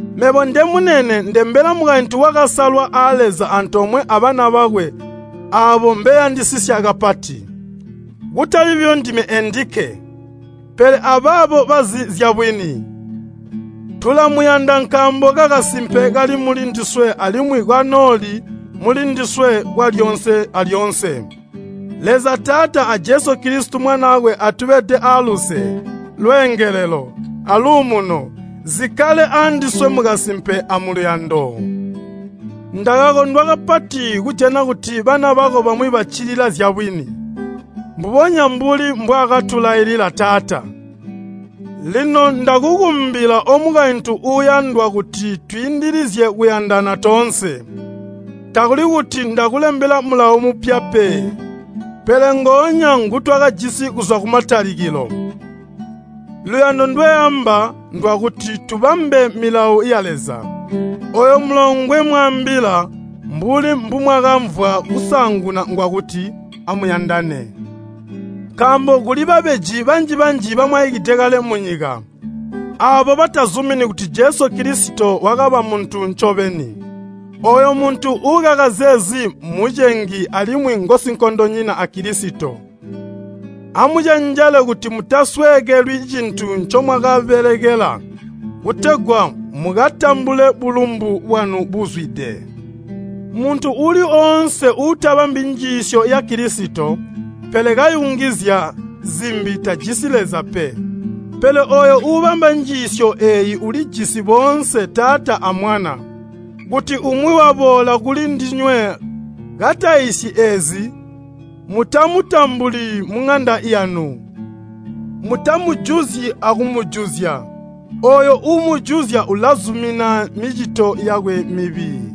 Mebo ndemunene ndembela mukaintu wakasalwa a Leza antoomwe abana bakwe aabo mbeyandisisya kapati. Kutali buyo ndime endikke, pele abaabo bazi zyabwini. Tulamuyanda nkaambo kakasimpe kali muli ndiswe alimwi kanooli muli ndiswe kwalyoonse alyoonse. Leza Taata a Jesu Kilisito Mwanaakwe atubede aaluse, lweengelelo, aluumuno, zikkale andiswe mukasimpe amuluyando. Ndakakondwa kapati kujana kuti bana bako bamwi baccilila zyabwini, mbubonya mbuli bwakatulailila Taata. Lino ndakukumbila omukaintu uuyandwa kuti twiindilizye kuyandana toonse. Takuli kuti ndakulembela mulawo mupya pe, pele ngoonya ngutwakajisi kuzwa kumatalikilo. Luyando ndweamba ndwakuti tubambe milawo ya Leza. Ooyu mulawo ngwemwaambila, mbuli mbumwakamvwa kusaanguna ngwakuti amuyandane. Nkaambo kuli babeji banji-banji bamwaikide kale munyika, aabo batazumini kuti Jesu Kilisito wakaba muntu ncobeni. Ooyo muntu uukaka zeezi mmucengi alimwi ngosinkondonyina a Kilisito. Amucenjele kuti mutasweekelwi cintu ncomwakabelekela, kutegwa mukatambule bulumbu bwanu buzwide. Muntu uuli woonse uutabambi njiisyo ya Kilisito, pele kayungizya zimbi tajisi Leza pe. Pele ooyo uubamba njiisyo eeyo ulijisi boonse Taata a Mwana. Kuti umwi waboola kuli ndinywe kataiisyi eezi, mutamutambuli muŋanda yanu. Mutamujuzyi akumujuzya. Ooyo uumujuzya ulazumina micito yakwe mibi.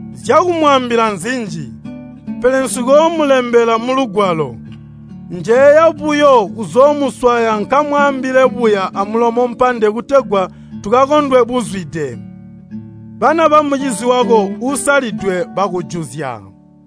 Zyakumwaambila nzinji, pele nsikoomulembela mulugwalo. Njeeya buyo kuzoomuswaya nkamwaambile buya amulomo mpande kutegwa tukakondwe buzwide. Bana bamucizi wako uusalidwe bakujuzya.